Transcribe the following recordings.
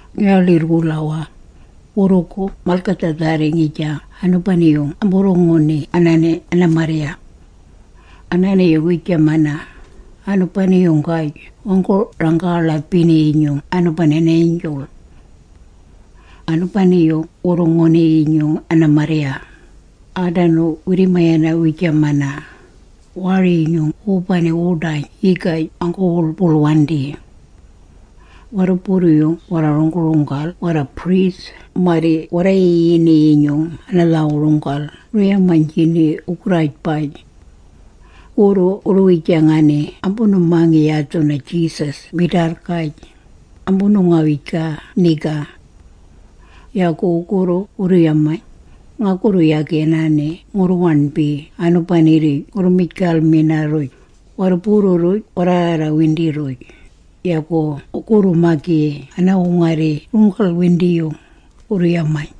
Ngi-waḻirr-wulawaa, wurrugu malgadhaadharri ngijang anubani-yung amburru-nguni anaani ana-marrya. Anaani-yung wiijamaa, anu…bani-yunggaj wanggu-rangga-ḻaabini-yinyung anubani ana-angel. Anubani-yung wurru-nguni-yinyung ana-marrya, aadanu wirri-mayana wiijamana, waari-yinyung wubani wuḏayn yigaj anggu-wuḻbuḻwandi. Warruburru-yung warra-runggu-runggal warra-priest marri warra-yiyini-yinyung ana-lhaawu-runggal wurru-yamiynjini wugurraajbaj. Wugurru wurru-wijangani ambunu-mangi yadhu na-Jesus midaarrgaj, ambunu-ngawijgaa niga. Yagu wugurru wurru-yamayn, “Ngagurru yagi anaani ngurru-waṉbi anubani-rruj ngurru-mijgalmina-rruj, warruburru-rruj warraarrawindi-rruj, yagu wu-ngarrgi-magi ana-wungarri runggal-windiyung,” wurru-yamaa.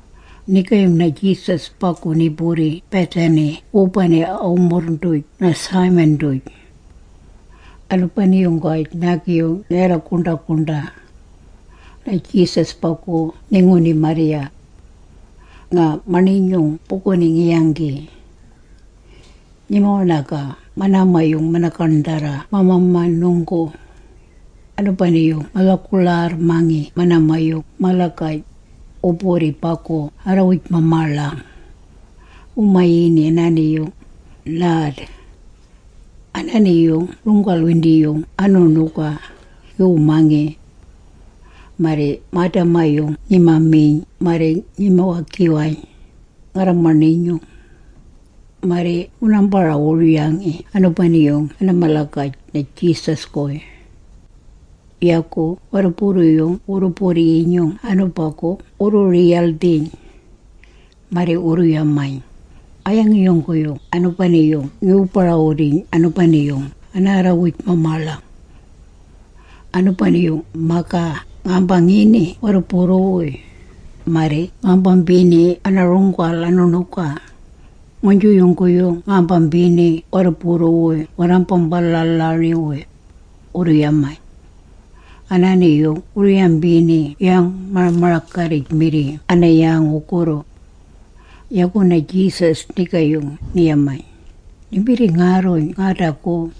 Nigaayung na-Jesus bagu ni-burri Bethany wubani a-wumurrng-duj na-Simon-duj. Anubani-yunggaj naagi-yung ni-warra-guṉḏa-guṉḏa. Na-Jesus bagu ni-nguni marrya. Nga maṉinyung buguni ngi-yanggi. Ngima-waṉagaa manaama-yung mana-gaṉdharra ma-mamanunggu. Anubani-yung ma-lhaguḻaarramangi manaama-yung malagaj, wu-burri bagu arrawuj-mamaaḻang. Wu-mayini anaani-yung, nard. Anaani-yung runggal-windiyung anu-ṉuga, ngiwu-mangi. Marri maadama-yung ngima-miyn marri ngima-wagiwayn, ngarra-maṉinyung. Marri ngunaambara-wuryiyn anubani-yung ana-malagaj na-Jesus-guy. Yagu warruburru-yung wurru-burri-yinyung anubagu wurru-riyaldhiyn. Marri wurru-yamaa, “A-yangi yungguyung anubani-yung ngiwu-barawudiyn anubani-yung anaarrawuj-mamaaḻang? Anubani-yung-magaa ngaambini warruburru-wuy, marri ngambambiini ana-runggal anu-ṉuga, nguynju yungguyung ngambiini warruburru-wuy warraambalalari-wuy,” wurru-yamayn. Anaani-yung wurru-yambini yang-mara-maragarrij-mirri ana-yang wugurru. Yagu na-Jesus nigaayung ni-yamayn, “Nimbirringaarruyn ngaadagu.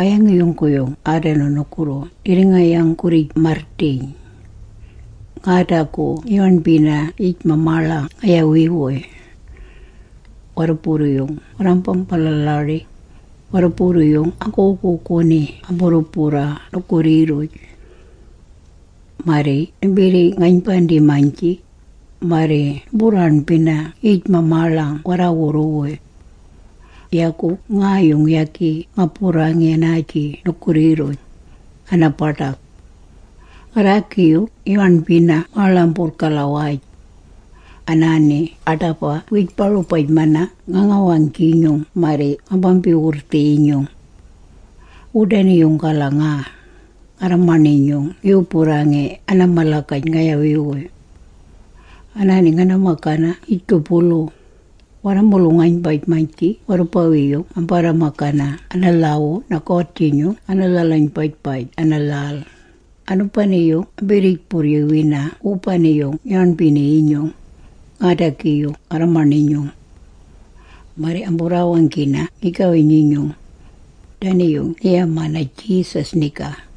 A-yangi yungguyung aadanu nugurru nirringa-yang-gurrij-marrdiyn? Ngaadagu ngi-waṉbina yij-mamaaḻang ngayawi-wuy. Warruburru-yung warraambalalari, warruburru-yung anggu-wuguuguni amburru-burraa nugurri-rruj. Marri nimbirri-ngaynbandang-maynji, marri numburraaṉbina yij-mamaaḻang warruburru-wuy. Yagu ngaayung yagi nga-burrangi anaaji nugurri-rruj, ana-baḏag. Ngarraagi-yung ngi-waṉbini maaḻamburrg-galawaj. Anaani aḏaba wiij-barubaj-mana nga-ngawang-jinyung marri ngambambi-wurrdhii-yinyung. Wudani-yung-gala nga, ngarra-maṉinyung ngiwu-burrangi ana-malagaj ngayawi-wuy. Anaani ngana-magana yijgubulu, warra-mulung-aynbaj-maynji warrubawi-yung ambarra-magana ana-lhaawu na-God-jinyung ana-lhal-aynbaj-gala ana-lhal, anubani-yung ambirriij-burryuwina wubani-yung ngi-waṉbini-yinyung, ngaadagi-yung ngarra-maṉinyung. Marri amburraawanggina ngigawi-nyinyung.” Dani-yung ni-yamayn na-Jesus niga.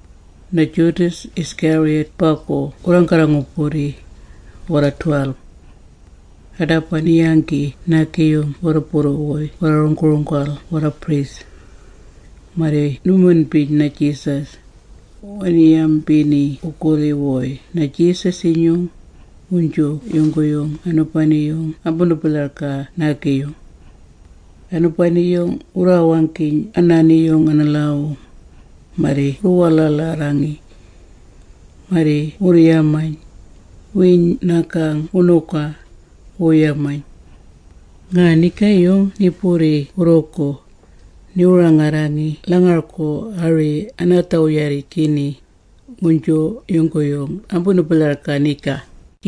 Na-Judas Iscariot bagu wurraanggarra-ngu-burri, warra-12. Aḏaba ni-yanggi naagi-yung warruburru-wuy warra-runggu-runggal warra-priest. Marri nu-minbini na-Jesus, wani-yambini wugurri-wuy na-Jesus-inyung, nguynju yungguyung anubani-yung ambunu-bilhargaa naagi-yung. Anubani-yung wurraawanggiyn anaani-yung ana-lhaawu, marri wurru-waḻaaḻarriyn. Marri wurru-yamayn, “Wiiyn nagang wuṉuga,” wurru-yamayn. Nga nigaayung ni-burri wurrugu, niwu-rangarrangi lhal-ngargu ari anaa-dhaawu-rarrjangi, nguynju yungguyung ambunu-bilhargang niga.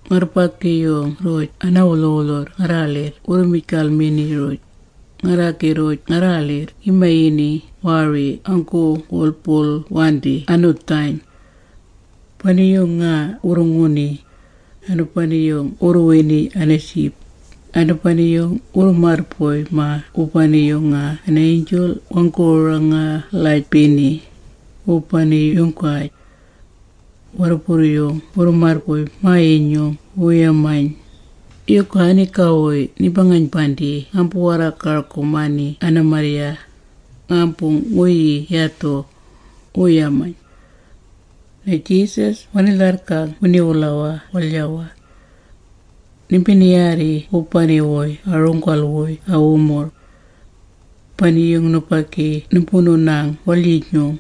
Ngarrubagi-rruj ana-wulhu-wulhurr ngarraaḻirr wurru-mijgalmini-rruj, ngarraagi-rruj ngarraaḻirr ngi-mayini “waari anggu-wuḻbuḻwandi anu-ḏayn”. Bani-yung nga wurru-nguni, anubani-yung wurru-wini ana-jib, anubani-yung wurru-marrbuy-maa wubani-yung yaga ana-angel wanggu-rangga-ḻaabini, wubani-yunggaj. Warruburru-yung wurru-marrbuy-maa-yinyung wurru-yamayn, “Yuga aniga-wuy nimba-ngaynbandiyn naambu-warraalgaalgurmani ana-marrya, ngaambu-nguyii yadhu?” wurru-yamayn. Na-Jesus wani-lharrgang wini-wulawaa waḻya-waa. “Nimbini-yaarri wubani-wuy a-runggal-wuy a-wumurrng. Bani-yung, nubagi numbunu-nang waḻyinyung,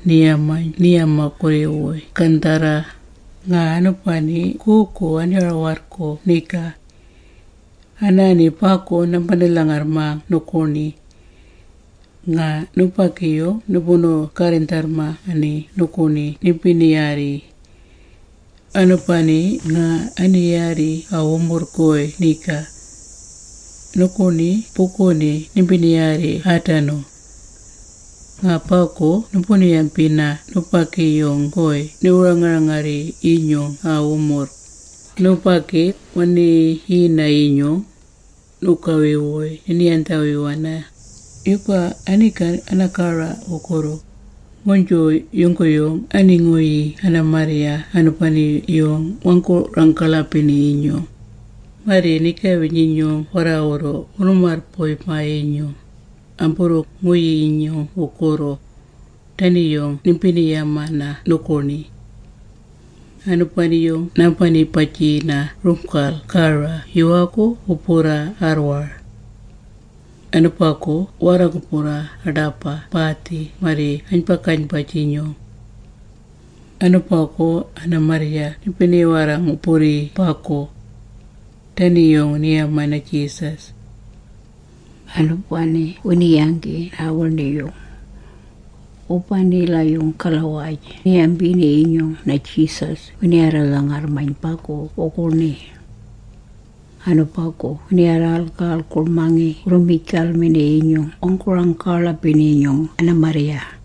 anima-warrguu gaṉdharra, nga anubani guugu ani-war-warrguu niga. Anaani bagu nambani-lhangarrmang nuguṉi. Nga nubagi-wuy numbunu-garrindharrmani nuguṉi nimbini-yaarri. Anubani nga ani-yaarri a-wumurrng-guy niga. Nuguṉi buguni nimbini-yaarri aadanu. Nga bagu numbunu-yambina nubagi-yung-guy niwu-rangarrii-yinyung a-wumurrng, ‘Nubagi wani-yiyina-yinyung, nugawi-wuy nini-yandhawiwana, yuga aniga ana-gara wugurru, nguynju yungguyung ani-nguyii ana-marrya anubani-yung wanggu-rangga-ḻaabini-yinyung, marri nigawi-nyinyung warraawurru wurru-marrbuy-mana-yinyung, amburru-nguyii yungguyung wugurru?’ Dani-yung nimbini-yamana nuguṉi. Anubani nambani-bajiyina runggal gara yuwaagu wu-burraa arrwar. Anubagu wu-warra-ngu-burraa aḏaba baadhi marri aynba-gaynbaj-jinyung. Anubagu ana-marrya nimbini-warra-ngu-burrii bagu.” Dani-yung ni-yamayn na-Jesus. Anubani wini-yanggi naawiṉi-yung. Wubanila-yung-gala-waj ni-yambini-yinyung na-Jesus wini-warra-lhangarrmayn bagu wuguṉi. Anubagu wini-warraalgaalgurmangi wurru-mijgalmini-yinyung wu-rangga-ḻaabini-yinyung ana-marrya.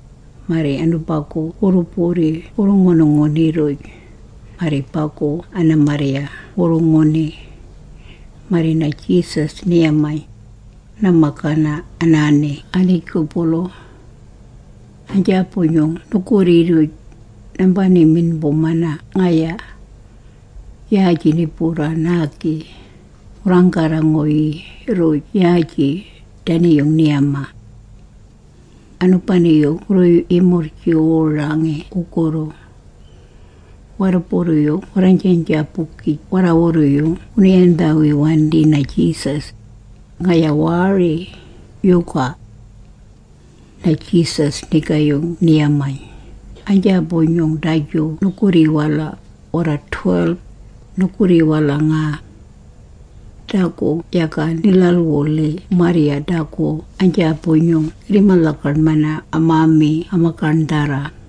Marri anubagu wurru-burri wurru-ngunu-nguni-rruj, marri bagu ana-marrya wurru-nguni. Marri na-Jesus ni-yamayn, “Ngana-magana anaani aniijgubulu. Aynjaabu-nyung nugurri-rruj, ngambani-minbumana ngaya. Yaaji ni-burraa naagi, ngurraanggarra-nguyii-rruj yaaji.” Dani-yung ni-yamaa. Anubani-yung wurru-yimurrjiwurangi wugurru. Warruburru-yung warraaynjaaynjaabugij warraawurru-yung wunu-yandhawiwandi na-Jesus, “Ngaya waari, yuga?” Na-Jesus nigaayung ni-yamayn, “Aynjaabu-nyung daju nugurri-wala, warra-12, nugurri-wala nga. Dagu yaga ni-lhalwulhii marrya dagu aynjaabu-nyung ngirrima-lhagaṉmayn amaami ama-gaṉdharra.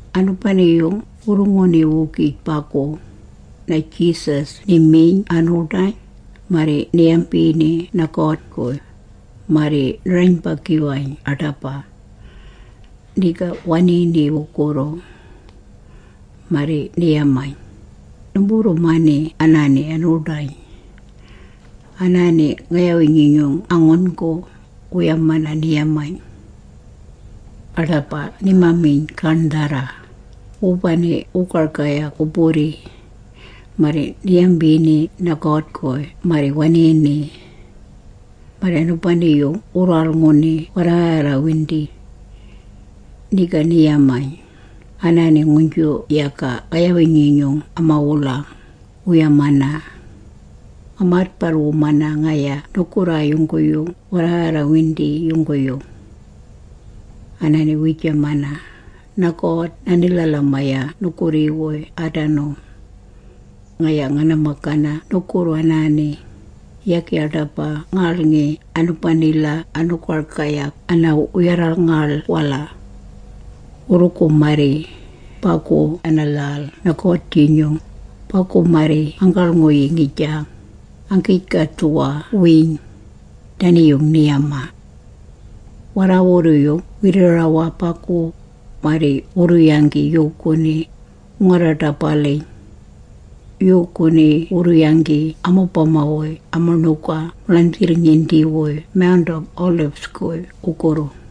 Anubani-yung wurru-nguni-wugij bagu, na-Jesus ni-miyn anu-ḏayn, marri ni-yambini na-God-guy, marri ni-rayn-bagiwayn aḏaba. Niga waniini wugurru. Marri ni-yamayn, “Numburru-mani anaani anu-ḏayn. Anaani ngayawi-nyinyung a-ngun.gu, wu-yamana,” ni-yamayn. Aḏaba nima-miyn gaṉdharra, wubani wugargayag wu-burri. Marri ni-yambini na-God-guy marri waniini. Marri anubani-yung wurru-waḻ-nguni warraarraarrawindi. Niga ni-yamayn, “Anaani nguynju yaga ngayawi-nyinyung ama-wulang, wu-yamana. Ngamaadbarrwumana ngaya nugurraa yungguyung warraarraarrawindi yungguyung. Anaani wiijamana, na-God nani-lhalamayana nugurri-wuy aadanu. Ngaya ngana-magana nugurru anaani, yagi aḏaba ngaaḻ-ngi anubanila anu-gargayag ana-wuyarrangaḻ-wala. Wurrugu marri, bagu ana-lhal na-God-jinyung, bagu marri nganggaḻ-nguyii ngijang, anggiij-gadhuwa-wiiyn.” Dani-yung ni-yamaa. Warraawurru-yung wirri-rawaa bagu, marri wurru-yanggi yuuguni, wuu-ngarra-ḏaba-rabaliyn. Yuuguni wurru-yanggi amubama-wuy ama-ṉuga ma-ḻandhirrngindi-wuy Mount of Olives-guy wugurru.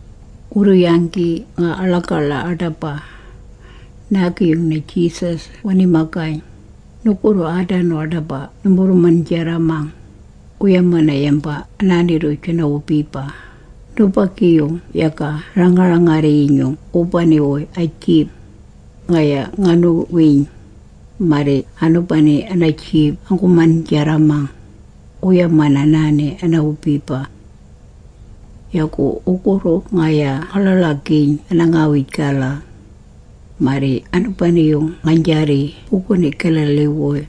Wurru-yanggi… nga aḻagaḻa aḏaba. Naagi-yung na-Jesus wani-magayn, “Nugurru aadanu aḏaba numburru-man-jarramang, wu-yamana yamba anaani-rruj ana-wubiba, ‘Nubagi-yung yaga ni-ranga-rangarrii-yinyung wubani-wuy a-jib, ngaya nganu-wiiyn, marri anubani ana-jib anggu-man-jarramang,’ wu-yamana anaani ana-wubiba. Yagu wurrugu ngaya nga-ḻaḻagiiyn ana-ngawij-gala. Marri anubani-yung ngaynjaarri buguni Galilee-wuy,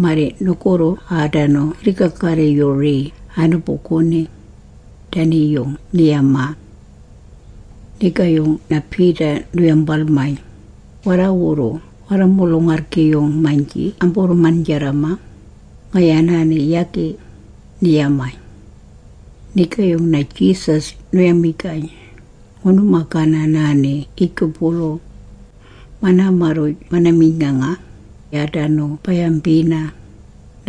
marri nugurru aadanu ngirri-ga-garri-yurii anubuguni.” Dani-yung ni-yamaa. Nigaayung na-Peter nu-yambalmayn, “Warraawurru warra-mulung-arrgi-yung-maynji amburru-man-jarramang, ngaya anaani yagi,” ni-yamayn. Nigaayung na-Jesus nu-yamijgayn, “Ngunu-magana anaani yijgubulu. Manaama-rruj mana-miyn.nganga, marri aadanu ba-yambina,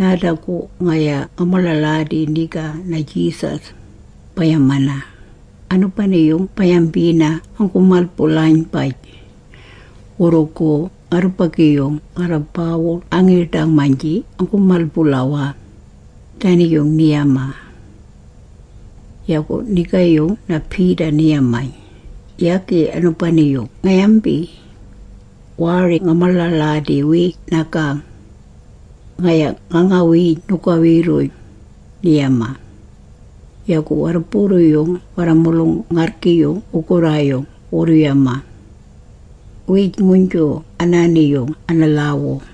‘Naadagu ngaya nga-maḻaḻadi niga na-Jesus,’ ba-yamang, anubani-yung ba-yambina anggu-mal-bulaynbaj. Wurrugu ngarrubagi-yung ngarra-baawul angiiḏang-maynji anggu-mal-bulawaa.” Dani-yung ni-yamayn. Yagu nigaayung na-Peter ni-yamayn, “Yagi anubani-yung nga-yambi! Waari nga-maḻaḻadi-wi nagang! Ngaya nga-ngawiiyn nugawi-rruj!” ni-yamaa. Yagu warruburru-yung warra-mulung-arrgi-yung wugurraayung wurru-yamaa, wiij-nguynju anaani-yung ana-lhaawu.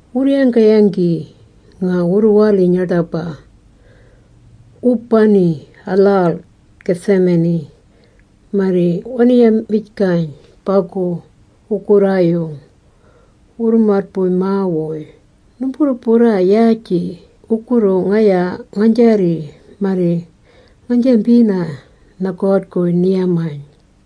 Wurru-yangga-yanggi… nga wurru-waliyn aḏaba, wubani a-lhal Gethsemane. Marri wani-yamijgayn bagu wugurraayung wurru-marrbuy-maa-wuy, “Numburru-burraa yaaji, wurrugu ngaya ngaynjaarri marri ngaynjambina na-God-guy,” ni-yamayn.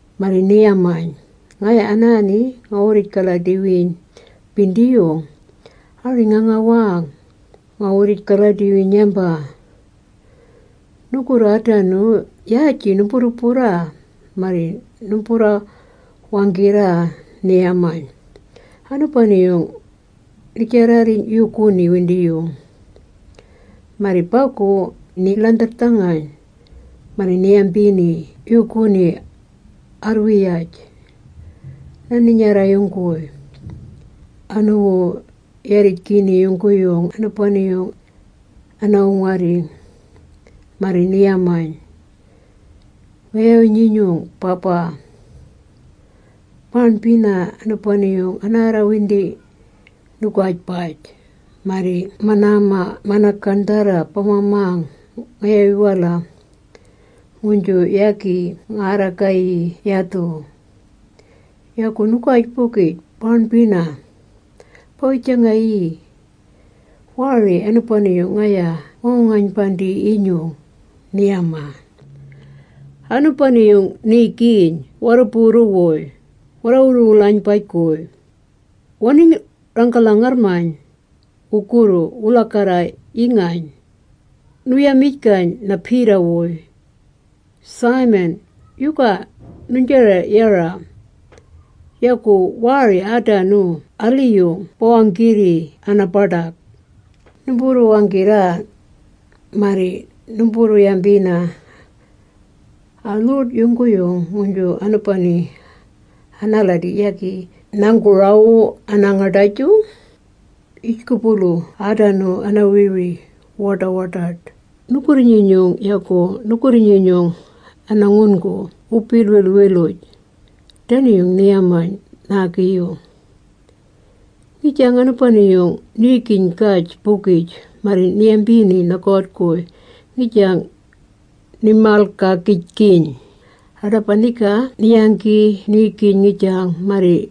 Marri ni-yamayn, “Ngaya anaani nga-wurrij-galadi-wiiyn-bindiyung, ari nga-ngawang, nga-wurrij-galadi-wiiyn yamba. Nugurru aadanu, yaaji numburru-burraa marri numburru-wanggirraa,” ni-yamayn. Anubani-yung ni-jarrarriyn yuuguni windiyung. Marri bagu ni-ḻandharrdhangayn, marri ni-yambini yuuguni arrwiyaj, na-Ninyarra-yung-guy, aniwu-yarini yungguyung anubani-yung ana-wungarri. Marri ni-yamayn, “Ngayawi-nyinyung Baba, baaṉbina anubani-yung anaarrawindi nugaajbaj. Marri manaama mana-gaṉdharra bama-mang ngayawi-wala, nguynju yagi ngaarragayi yadhu. Yagu nugaajbaj baaṉbina ba-wijangayii, waari anubani-yung ngaya ngawu-ngaynbandii-yinyung,” ni-yamaa. Anubani-yung niigiyn warruburru-wuy warra-wulu-wulaynbaj-guy, wani-rangga-lhangarrmayn wugurru wu-lhagarra-yingayn. Nu-yamijgayn na-Peter-wuy, “Simon, yuga nuynjara-yara? Yagu waari aadanu aliyung ba-wanggirri ana-baḏag? Numburru-wanggirraa, marri numburru-yambina a-lhuḏ yungguyung, nguynju anubani anaaladi yagi nanggu-rawu anaangaḏajung. Yijgubulu aadanu ana-wiri wu-waḏa-waḏaḏ nugurri-nyinyung, yagu nugurri-nyinyung ana-ngun.gu wu-bilwilwiluj.” Dani-yung ni-yamaa naagi-yung. Ngijang anubani-yung niigiyn-gaj-bugij, marri ni-yambini na-God-guy ngijang, ni-malgaagijgiyn. Aḏaba niga ni-yanggi niigiyn ngijang, marri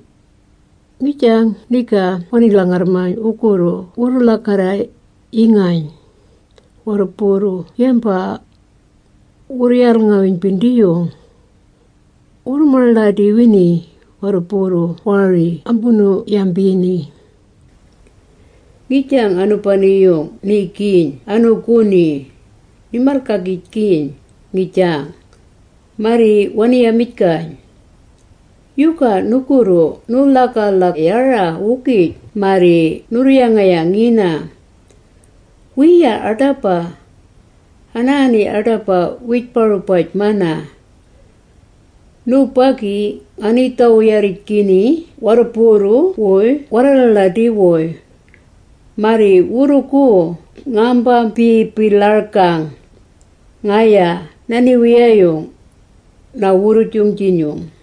ngijang niga wani-lhangarrmayn wugurru wurru-lhagarra-yingayn, warruburru yamba wurru-yaal-ngawiiyn-bindiyung. Wurru-maḻaḻadi-wini, warruburru waari ambunu-yambini. Ngijang anubani-yung niigiyn anuuguni, ni-malgaagijgiyn niigiyn. Marri wani-yamijgayn, “Yagu nugurru nuu-lhagarra-yara-wugij marri nurru-yanga-yangina? Wiiya aḏaba. Anaani aḏaba wiij-barubaj-mana. Nubagi nganii-dhaawu-yarrijgini warruburru-wuy warraalaaladi-wuy, marri ngambambi-bilhargang, ngaya na-Niwiyayung na-Wurrujung-jinyung.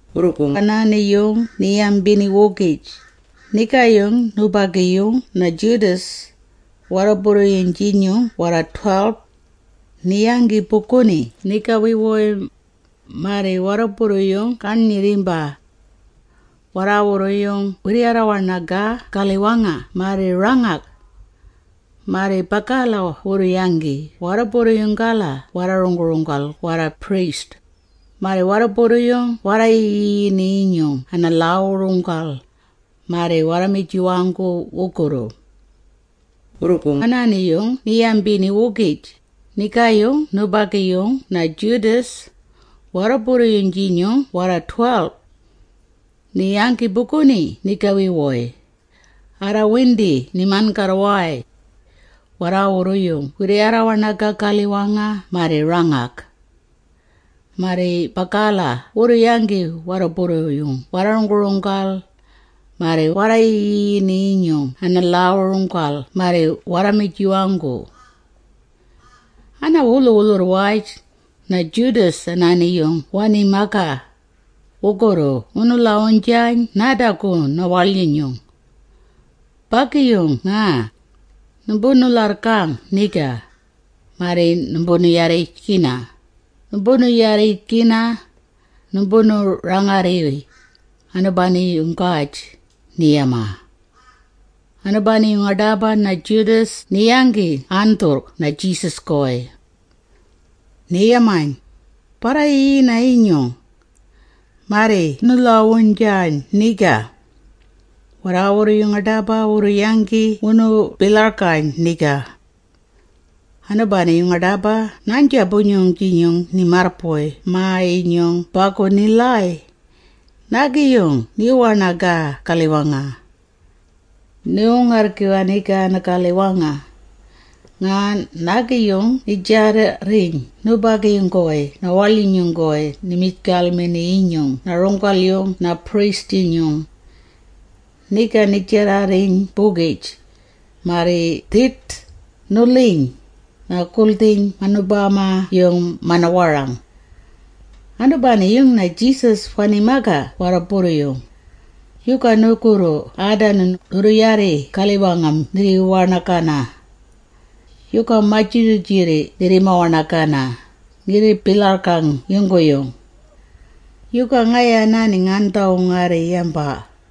Wurrugu anaani-yung ni-yambini-wugij, nigaayung nubagi-yung na-Judas, warruburru-yung-jinyung warra-12, ni-yanggi buguni nigawi-wuy, marri warruburru-yung garnyirrimba. Warraawurru-yung wirri-warra-waṉagaa galiwanga marri rangag. Marri bagala wurru-yanggi warruburru-yung-gala warra-runggu-runggal warra-priest, marri warruburru-yung warra-yiyini-yinyung ana-lhaawu-runggal, marri warra-mijiwanggu wugurru. Wurrugu anaani-yung ni-yambini-wugij, nigaayung nubagi-yung na-Judas, warruburru-yung-jinyung warra-12. Ni-yanggi buguni nigawi-wuy. Arraarrawindi ni-man-garrwaay. Warraawurru-yung wirri-warra-waṉagaa galiwanga marri rangag. Marri bagala wurru-yanggi warruburru-yung warra-runggu-runggal, marri warra-yiyini-yinyung ana-lhaawu-runggal marri warra-mijiwanggu. Ana-wulhu-wulhurr-waj, na-Judas anaani-yung wani-magaa, “Wurrugu nganu-lhawuynjang naadagu na-waḻyinyung. Bagi-yung nga. Numbunu-bilhargang niga, marri numbunu-yarrijgina, numbunu-yarina, numbunu-rangarrii,” anubani-yunggaj ni-yamaa. Anubani-yung aḏaba na-Judas ni-yanggi andhurrg na-Jesus-guy. Ni-yamayn, “Barra-yiyina-yinyung!” marri nu-lhaawuynjayn niga. Warraawurru-yung aḏaba wurru-yanggi wunu-bilhargayn niga. Anubani-yung aḏaba naaynjaabu-nyung ni-marrbuy-maa-yinyung bagu ni-lhaay. Naagi-yung niwu-waṉagaa galiwanga. Niwu-ngarrgiwaa niga, ana-galiwanga, nga naagi-yung ni-jarrarriyn nubagi-wuy na-waḻyinyung-guy naa-mijgalmini-yinyung na-runggal-yung na-priest-jung. Niga ni-jarrarriyn-bugij, marri dhiḏ! Nu-lhiyn! Naa-guldhiyn manubama-yung mana-warang. Anubani-yung na-Jesus wani-magaa warruburru-yung, “Yuga nugurru aadanu nurru-yanggi galiwanga nirri-warra-waṉagana? Yuga majirrijirri nirrima-waṉagana, ngirri-bilhargaa yungguyung? Yuga ngaya anaani ngaandha-wungarri yamba?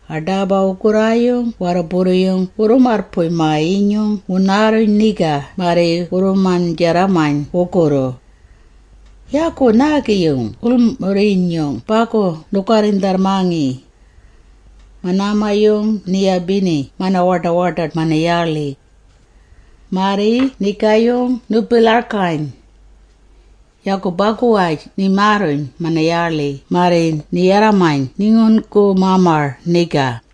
Aḏaba wugurraayung warruburru-yung wurru-marrbuy-maa-yinyung wunaarruyn niga marri wurru-man-jarramayn wugurru. Yagu naagi-yung wulmurr-inyung bagu nu-garrindharrmangi. Manaama-yung ni-yabini ma-waḏa-waḏaḏ mana-yaaḻi. Marri nigaayung wunu-bilhargayn. Yagu bagu-waj nimaarruyn mana-yaaḻi marri ni-yarramayn ni-ngun.gu-mamar niga.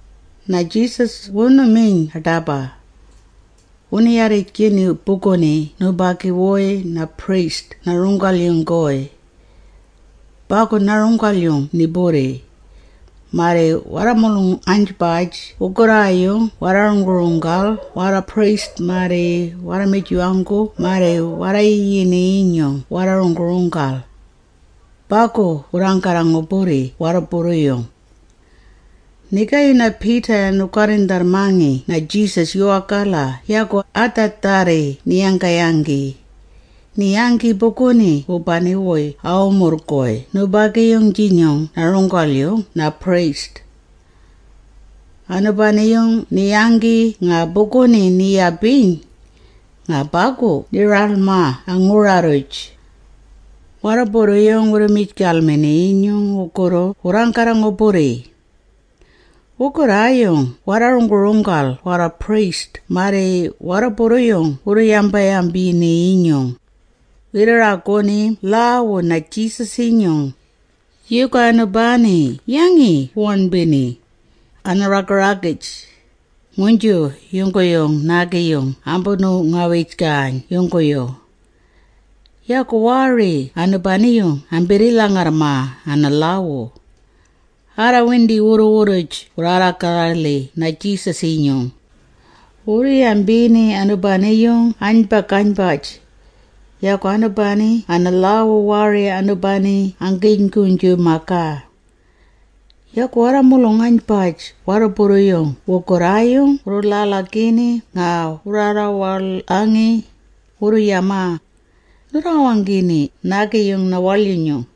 Na-Jesus wunu-miyn aḏaba. Wunu-yarrijgini buguni nubagi-wuy na-priest na-runggal-yung-guy. Bagu na-runggal-yung ni-burri, marri warra-mulung-aynbaj wugurraayung warra-runggu-runggal warra-priest marri warra-mijiwanggu marri warra-yiyini-yinyung ana-lhaawu-runggal. Bagu wurraanggarra-ngu-burri warruburru-yung. Nigaayung na-Peter nu-garrindharrmangi na-Jesus, yuwaagala yagu adhaa…dharri ni-yangga-yanggi. Ni-yanggi buguni wubani-wuy a-wumurrng-guy nubagi-yung-jinyung na-runggal-yung na-priest. Anubani-yung ni-yanggi nga buguni ni-yabiyn. Nga bagu ni-ralmaa a-ngura-rruj. Warruburru-yung wurru-mijgalmini-yinyung wugurru wurraanggarra-ngu-burri. Wugurraayung warra-runggu-runggal warra-priest marri warruburru-yung wuu-yamba-yambini-yinyung, wirri-raguni lhaawu na-Jesus-inyung, yuga anubani yangi wu-waṉbini, ana-raga-ragij, nguynju yungguyung naagi ambunu-ngawijgayn yungguyung. Yagu waari anubani-yung ambirri-lhangarrmaa ana-lhaawu. Arraarrawindi wurru-wurruj wurraawaḻangi na-Jesus-inyung, wurru-yambini anubani-yung aynba-gaynbaj, yagu anubani ana-lhaawu waari anubani anggiyn-nguynju-magaa. Yagu warra-mulung-aynbaj warruburru-yung wugurraayung wuu-ḻaḻagini nga wurraawaḻangi, wurru-yamaa, “Nurraawanggini naagi-yung na-waḻyinyung,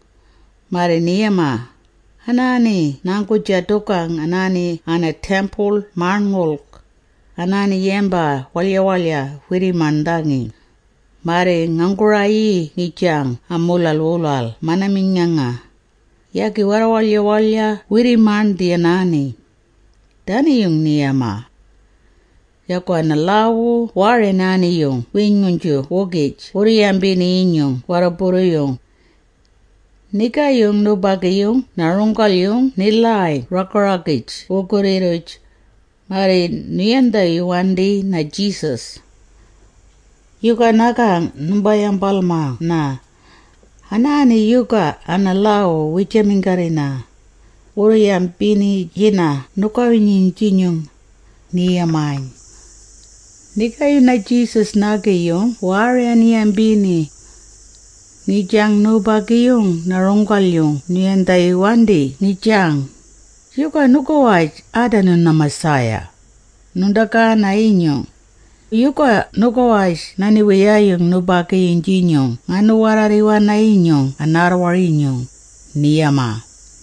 marri ni-yamaa, ‘Anaani nganggu-jadugang anaani ana-Temple-Maṉngulg, anaani yamba waḻya-waḻya wirri-maṉdhangi, marri nganggu-rayii ngijang amuulawaa-wala mana-miyn.nganga, yagi warra-waḻya-waḻya wirri-maṉdhi anaani.’” Dani-yung wurru-yamaa. Yagu ana-lhaawu waari anaani-yung wiij-nguynju-wugij wurru-yambini-yinyung warruburru-yung. Nigaayung nubagi-yung na-runggal-yung ni-lhangayn raga-ragij wugurri-rruj, marri nu-yandhawiwandi na-Jesus. “Yuga nagang numba-yambalmana? Anaani yuga ana-lhaawu wu-yaminggarrina, wurru-yambiynjina nugawi-nyinyung?” ni-yamayn. Nigaayung na-Jesus naagi-yung waari ani-yambini. Ngijang nubagi-yung na-runggal-yung nu-yandhawiwandi ngijang, “Yuga nugawaj aadanu na-Messiah, nuṉḏagaana-yinyung, yuga nugawaj na-Niwiyayung nubagi-yung-jinyung ngaanu-warraarriwana-yinyung anaarrwar-yinyung?” ni-yamaa.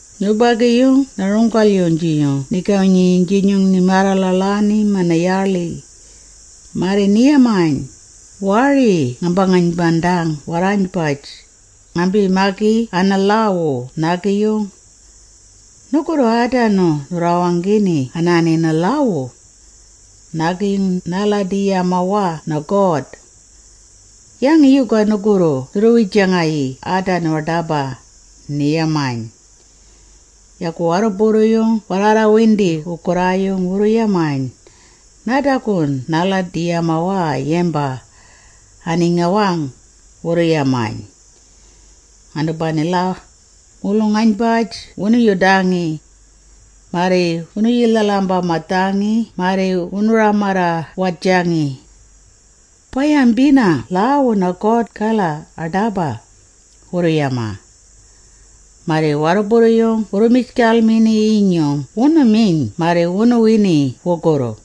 Nubagi-yung na-runggal-yung nigawi-nyinyung nimaarra-ḻaḻaani mana-yaaḻi, marri ni-yamayn, “Waari ngaamba-ngaynbandang warraaynbaj, ngarrambi-magi ana-lhaawu naagi-yinyung. Nugurru aadanu nurraawanggini anaani ana-lhaawu. Naagi-yung naaladi-yamawaa na-God! Yangi yuga nugurru nurru-wijangayii aadanu aḏaba?” ni-yamayn. Yagu warruburru-yung warraarrawindi wugurraayung wurru-yamayn, “Naadagu naaladi-yamawaa yamba, ani-ngawang,” wurru-yamayn. Anubanila, mulung-aynbaj wunu-yudangi. Marri wunu-yilhal-ambamadhangi marri wunu-ramarra-wadjangi. “Ba-yambina lhaawu na-God-gala aḏaba!” wurru-yamaa. Marri warruburru-yung wurru-mijgalmini-yinyung wunu-miyn marri wunu-wini wugurru.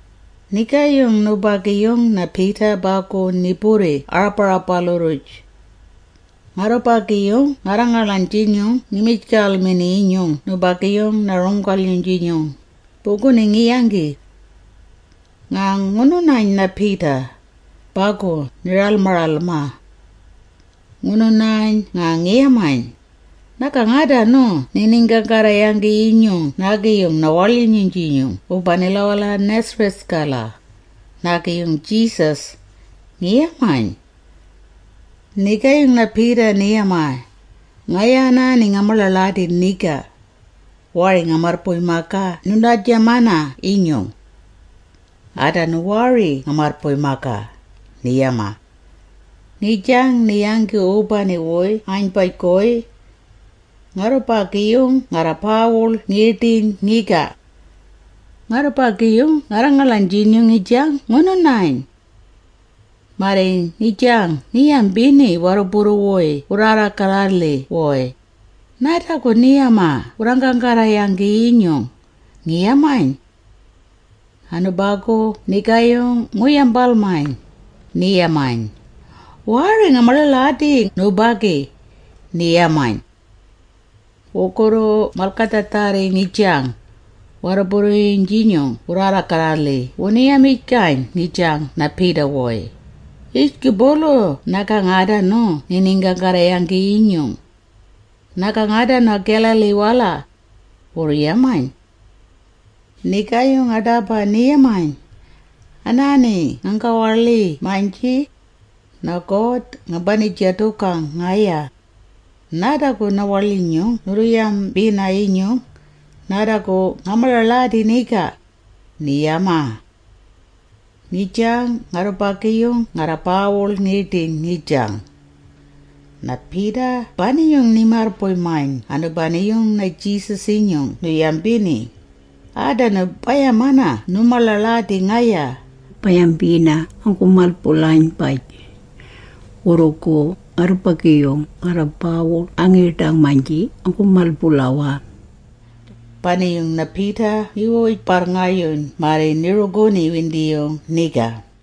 Nigaayung nubagi-yung na-Peter bagu ni-burri aarabarabalu-rruj. Ngarrubagi-yung ngarra-ngaḻaynjinyung ngi-mijgalmini-yinyung nubagi-yung na-runggal-yung-jinyung, buguni ngi-yanggi. Nga ngunu-nayn na-Peter, bagu ni-ralma-ralmaa. Ngunu-nani… nga ngi-yamayn, “Nagang aadanu niiniinggaanggarra-yanggi-yinyung naagi na-waḻyinyung wubanila a-Nazareth-gala, naagi na-Jesus,” ngi-yamayn. Nigaayung na-Peter ni-yamaa, “Ngaya anaani nga-maḻaḻadi niga. Waari nga-marrbuy-magaa nuynjambina-yinyung. Aadanu waari nga-marrbuy-magaa,” ni-yamaa. Ngijang ni-yanggi wubani-wuy aaynbaj-guy. Ngarrubagi-yung ngarra-baawul ngiiḏiyn ngiga. Ngarrubagi-yung ngarra-ngaḻaynjinyung ngijang ngunu-nayn. Marri ngijang ngi-yambini warruburru-wuy wurraarra-garra-lhi-wuy, “Naadagu ni-yamana wurraanggaanggarra-yanggi-yinyung,” ngi-yamayn. Anubagu nigaayung ngu-yambalmayn, ni-yamayn, “Waari, nga-maḻaḻadi nubagi,” ni-yamayn. Wurrugu malgadhaadharri ngijang, warruburru-yung-jinyung wurraarra-garra-lhi wunu-yamijgayn ngijang na-Peter-wuy, “Yijgubulu nagang aadanu niiniinggaanggarra-yanggi-yinyung. Nagang aadanu Galilee-wala!” wurru-yamayn. Nigaayung aḏaba ni-yamayn, “Anaani nganggawaḻii-maynji, na-God ngambani-jadugang ngaya! Naadagu na-waḻyinyung nurru-yambina-yinyung, naadagu nga-maḻaḻadi niga!” ni-yamaa. Ngijang ngarrubagi-yung ngarra-baawul ngiiḏiyn ngijang. Na-Peter bani-yung ni-marrbuy-mayn anubani-yung na-Jesus-inyung nu-yambini, “Aadanu ba-yamana nu-maḻaḻadi ngaya, ba-yambina anggu-mal-bulaynbaj. Wurrugu ngarrubagi-yung ngarra-baawul angiiḏang-maynji anggu-mal-bulawaa.” Yagu bani-yung na-Peter ni-wij-barrngayuyn marri ni-ruguni-windiyung niga.